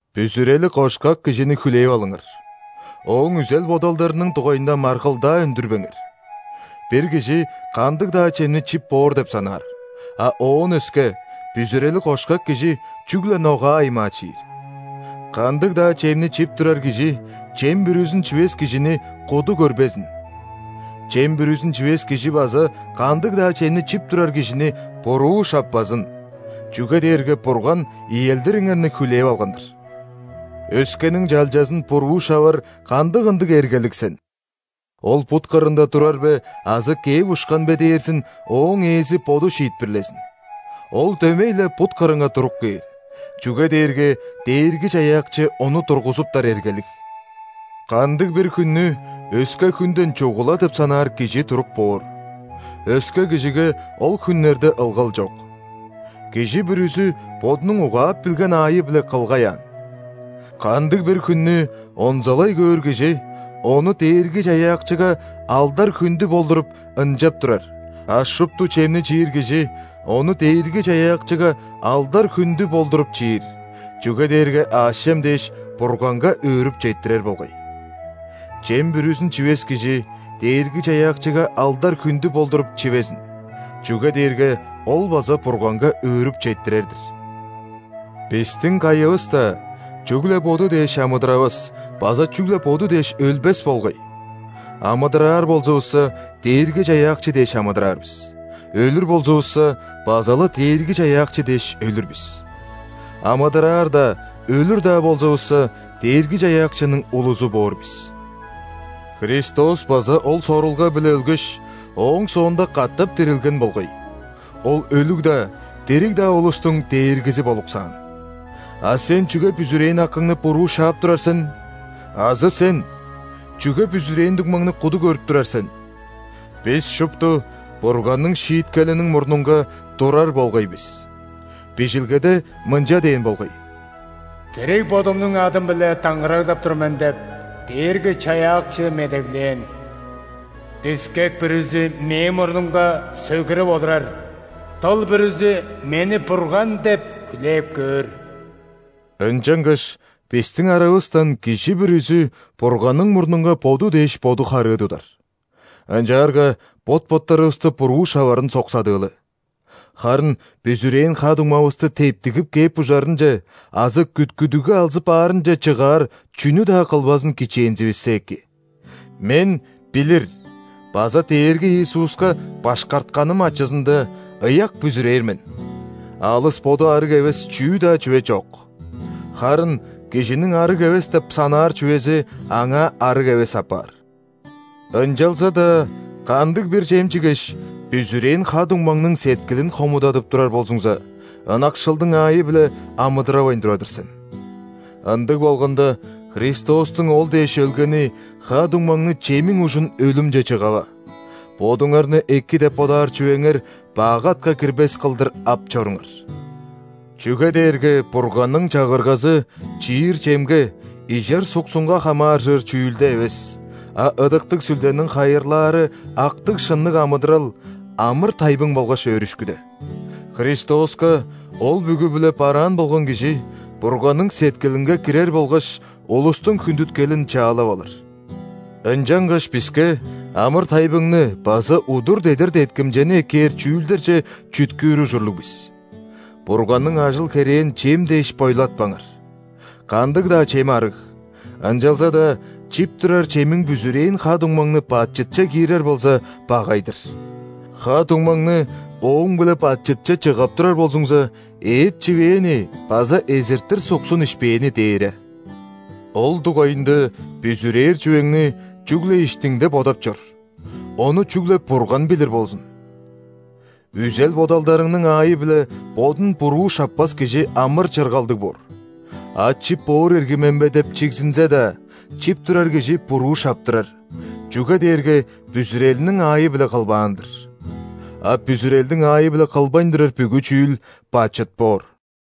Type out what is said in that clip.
Бүзүрели кошкак кижини хүлээп алыңар, ооң үзел-бодалдарының дугайында маргылдаа үндүрбеңер. Бир кижи кандыг-даа чемни чип боор деп санаар, а оон өске, бүзүрели кошкак кижи чүгле ногаа аймаа чиир. Кандыг-даа чемни чип турар кижи чем бүрүзүн чивес кижини куду көрбезин. Чем бүрүзүн чивес кижи база кандыг-даа чемни чип турар кижини буруу шаппазын. Чүге дээрге Бурган иелдириңерни хүлээп алган-дыр. Өскениң чалчазын буруу шавар кандыг ындыг эргелиг сен? Ол бут кырында турар бе азы кээп ушкан бе дээрзин ооң Ээзи боду шиитпирлезин. Ол дөмей-ле бут кырынга туруп кээр, чүге дээрге Дээрги-Чаяакчы ону тургузуптар эргелиг. Кандыг-бир хүннү өске хүнден чугула деп санаар кижи туруп боор. Өске кижиге ол хүннерде ылгал чок. Кижи бүрүзү бодунуң угаап билген аайы-биле кылгай аан. Кандыг-бир хүннү онзалай көөр кижи ону Дээрги-Чаяакчыга алдар-хүндү болдуруп, ынчап турар, а шупту чемни чиир кижи ону Дээрги-Чаяакчыга алдар-хүндү болдуруп, чиир, чүге дээрге аъш-чем дээш, Бурганга өөрүп четтирер болгай. Чем бүрүзүн чивес кижи Дээрги-Чаяакчыга алдар-хүндү болдуруп, чивезин, чүге дээрге ол база Бурганга өөрүп четтирер-дир. Бистиң кайывыс-даа чүгле боду дээш амыдыравас база чүгле боду дээш өлбес болгай. Амыдыраар болзувусса, Дээрги-Чаяакчы дээш амыдыраар бис, өлүр болзувусса, база-ла Дээрги-Чаяакчы дээш өлүр бис. Амыдыраар-даа, өлүр-даа болзувусса, Дээрги-Чаяакчының улузу боор бис. Христос база ол сорулга-биле өлгеш, ооң соонда катап дирилген болгай. Ол өлүг-даа, дириг-даа улустуң Дээргизи болуксаан. А сен чүге бүзүрээн акыңны буруу шаап турар сен? Азы сен? Чүге бүзүрээн дуңмаңны куду көрүп турар сен? Бис шупту Бурганның шииткелиниң мурнунга турар болгай бис. Бижилгеде мынча дээн болгай:«Дириг Бодумнуң адым-биле даңгыраглап тур мен – деп,Дээрги-Чаяакчы медеглээн. –Дискек бүрүзү Мээң мурнумга сөгүрүп олурар,дыл бүрүзү Мени Бурган деп хүлээп көөр». Ынчангаш бистиң аравыстан кижи бүрүзү Бурганның мурнунга боду дээш боду харыы тудар. Ынчаарга бот-боттарывысты буруу шаварын соксадыылы. Харын бүзүрээн ха-дуңмавысты тептигип кээп ужарынче азы күткүдүгге алзып аарынче чыгаар чүнү-даа кылбазын кичээнзивиссе эки. Мен билир база Дээрги Иисуска башкартканым ачызында, ыяк бүзүрээр мен: алыс боду ·арыг эвес чүү-даа чүве чок. Харын кижиниң арыг эвес деп санаар чүвези аңаа арыг эвес апаар. Ынчалза-даа кандыг-бир чем чигеш, бүзүрээн ха-дуңмаңның сеткилин хомудадып турар болзуңза, ынакшылдың аайы-биле амыдыравайн турар-дыр сен. Ындыг болганда, Христостуң ол дээш өлгени ха-дуңмаңны чемиң ужун өлүмче чыгава. Бодуңарны эки деп бодаар чүвеңер бак атка кирбес кылдыр ап чоруңар. Чүге дээрге Бурганның Чагыргазы – чиир чемге, ижер суксунга хамааржыр чүүлде эвес, а Ыдыктыг Сүлдениң хайырлаары актыг-шынныг амыдырал, амыр-тайбың болгаш өөрүшкүде. Христоска ол бүгү-биле бараан болган кижи Бурганның сеткилинге кирер болгаш улустуң хүндүткелин чаалап алыр. Ынчангаш биске амыр-тайбыңны база удур-дедир деткимчени эккээр чүүлдерже чүткүүр ужурлуг бис. Бурганның ажыл-херээн чем дээш бойлатпаңар. Кандыг-даа чем ·арыг, ынчалза-даа чип турар чемиң бүзүрээн ха-дуңмаңны бачытче киирер болза, багай-дыр. Ха-дуңмаңны ооң-биле бачытче чыгап турар болзуңза, эът чивээни база эзиртир суксун ишпээни дээре. Ол дугайында бүзүрээр чүвеңни чүгле иштиңде бодап чор, ону чүгле Бурган билир болзун. Үзел-бодалдарының аайы-биле бодун буруу шаппас кижи амыр-чыргалдыг боор. А чип боор ирги мен бе деп чигзинзе-даа, чип турар кижи буруу шаптырар, чүге дээрге бүзүрелиниң аайы-биле кылбаан-дыр. А бүзүрелдиң аайы-биле кылбайн турар бүгү чүүл – бачыт боор.